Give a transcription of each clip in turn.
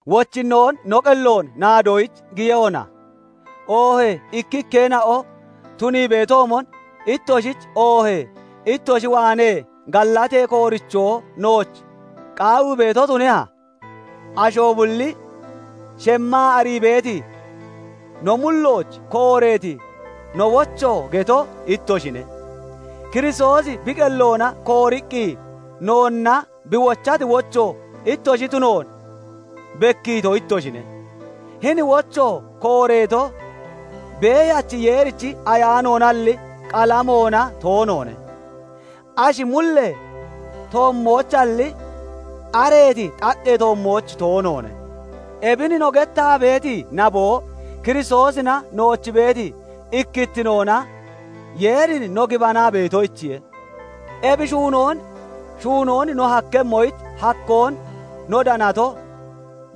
Wochinnoon no qelloon naadoyich giyehona? Oohee ikkikkeena'o tunii beetoomon ittoshich oohee ittoshi waanee gallatee koorichoo nooch qaawii beeto tuneha? Asho bulli shemmaa arii beeti, no mullooch kooreeti no wocho geto ittoshine. Kiristoosi bi qelloona kooriqqi noonna bi wochati wocho ittoshi tunoon bekkiito ittoshine; hini wocho kooreeto beeyachi Yeerichi Ayaanoonalli, qalamoona toonoone; ashi mullee toommoochalli, xareeti xaqqee toommooch toonoone. Ebin no gettaa beeti naboo Kiristoosina nooch beeti ikkittinoona Yeerin no gibanaa beetoyichiye. Ebi shuunoon shuunoon no hakkemmoyich hakkoon no danato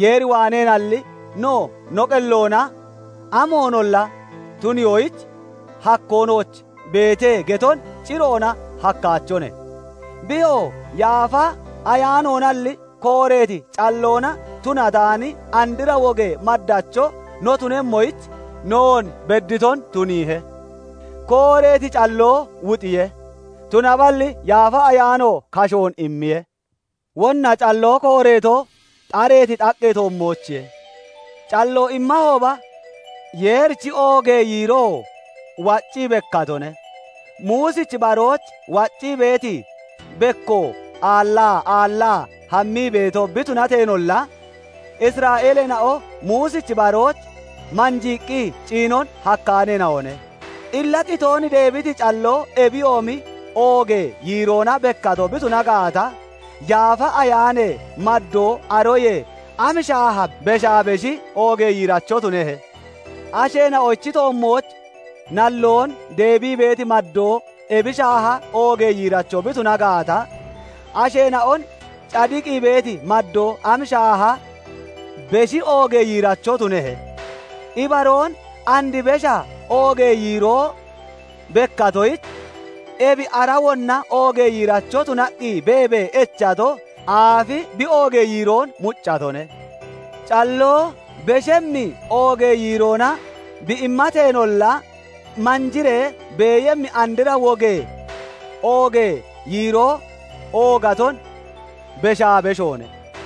Yeer waaneenalli, no no qelloona amoonolla tuniyoyich "Hakkoo nooch beete" geton ciroona hakkaachone. Biyoo Yaafa Ayaanoonalli kooreeti calloona tunataani andra wogee maddacho no tunemmoyich noon bedditon tuniihe. Kooreeti calloo wuxiye; tunaballi Yaafa Ayaano kashoon immiye. Wonna calloo kooreeto, xareeti xaqqee toommoochiye; calloo immahooba, Yeerichi oogee yiiroo waccii bekkatone; Muusichi barooch wacciibee beeti bekko aallaa aallaa hammii beeto bi tunateenolla, Isra'eeleena'o Muusichi barooch manjiiqqi ciinon hakkaaneena'one. Illa qitoon deebiti calloo ebiyoomi oogee yiiroona bekkato bi tuna gaata, Yaafa Ayaanee maddoo aroyee am shaaha beshaa beshi oogee yiiracho tunehe? Asheena'ochi toommooch nalloon deebii beeti maddoo ebi shaaha oogee yiiracho bi tuna gaata, asheena'on cadiqii beeti maddoo am shaaha beshi oogee yiiracho tunehe? Ibaroon, and besha oogee yiiroo bekkatoyich, ebi ara wonna oogee yiiracho tunaqqi beebee echato aafi bi oogee yiiroon muccatone. Calloo beshemmi oogee yiiroona bi immateenolla, manjiree beeyemmi andra wogee oogee yiiroo oogaton beshaa beshoone.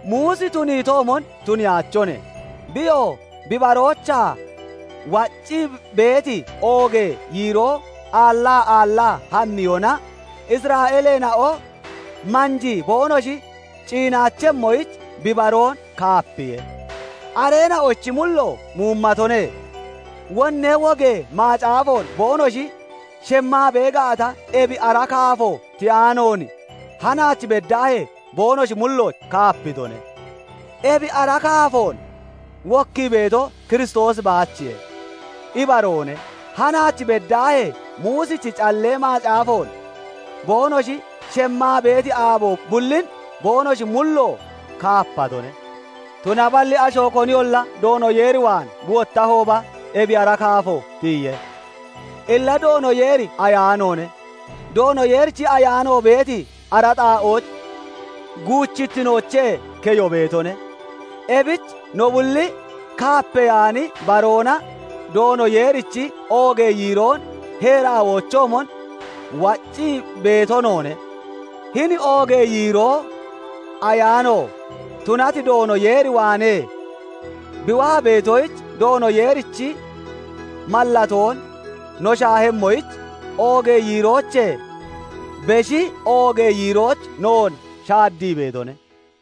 Muusi tuniitoomon tuniyaachone; biyoo bi baroochaa waccii beeti oogee yiiroo aallaa aallaa hammiyona, Isra'eeleena'o manjii boonoshi ciinaachemmoyich, bi baroon kaapiye. Areena'ochi mullo muumatone; wonnee wogee macaafoon boonoshi shemmaa bee gaata, ebi ara kaafo tiyaanoon hanaach beddaahee boonoshi mulloon kaapitone; ebi ara kaafoon wokkii beeto Kiristoosi baachiye. Ibaroone; hanaach beddaahee, Muusichi Callee Macaafoon boonoshi shemmaa beeti aabo bullin boonoshi mullo kaapatone; tunaballi asho koniyolla Doono Yeer waan bi wottahooba, ebi ara kaafo tiyiye. Illa Doono Yeeri Ayaanoone; Doono Yeerichi Ayaano beeti ara xaa'ooch guuchittinoochee keyo beetone. Ebich no bulli kaapeyaani baroona Doono Yeerichi oogee yiiroon heeraawoochoomon waccii beeto noone; hini oogee yiiroo Ayaano tunati Doono Yeer waanee bi waa beetoyich, Doono Yeerichi mallatoon no shaahemmoyich, oogee yiiroochee beshi oogee yiirooch noon shaddii beetone.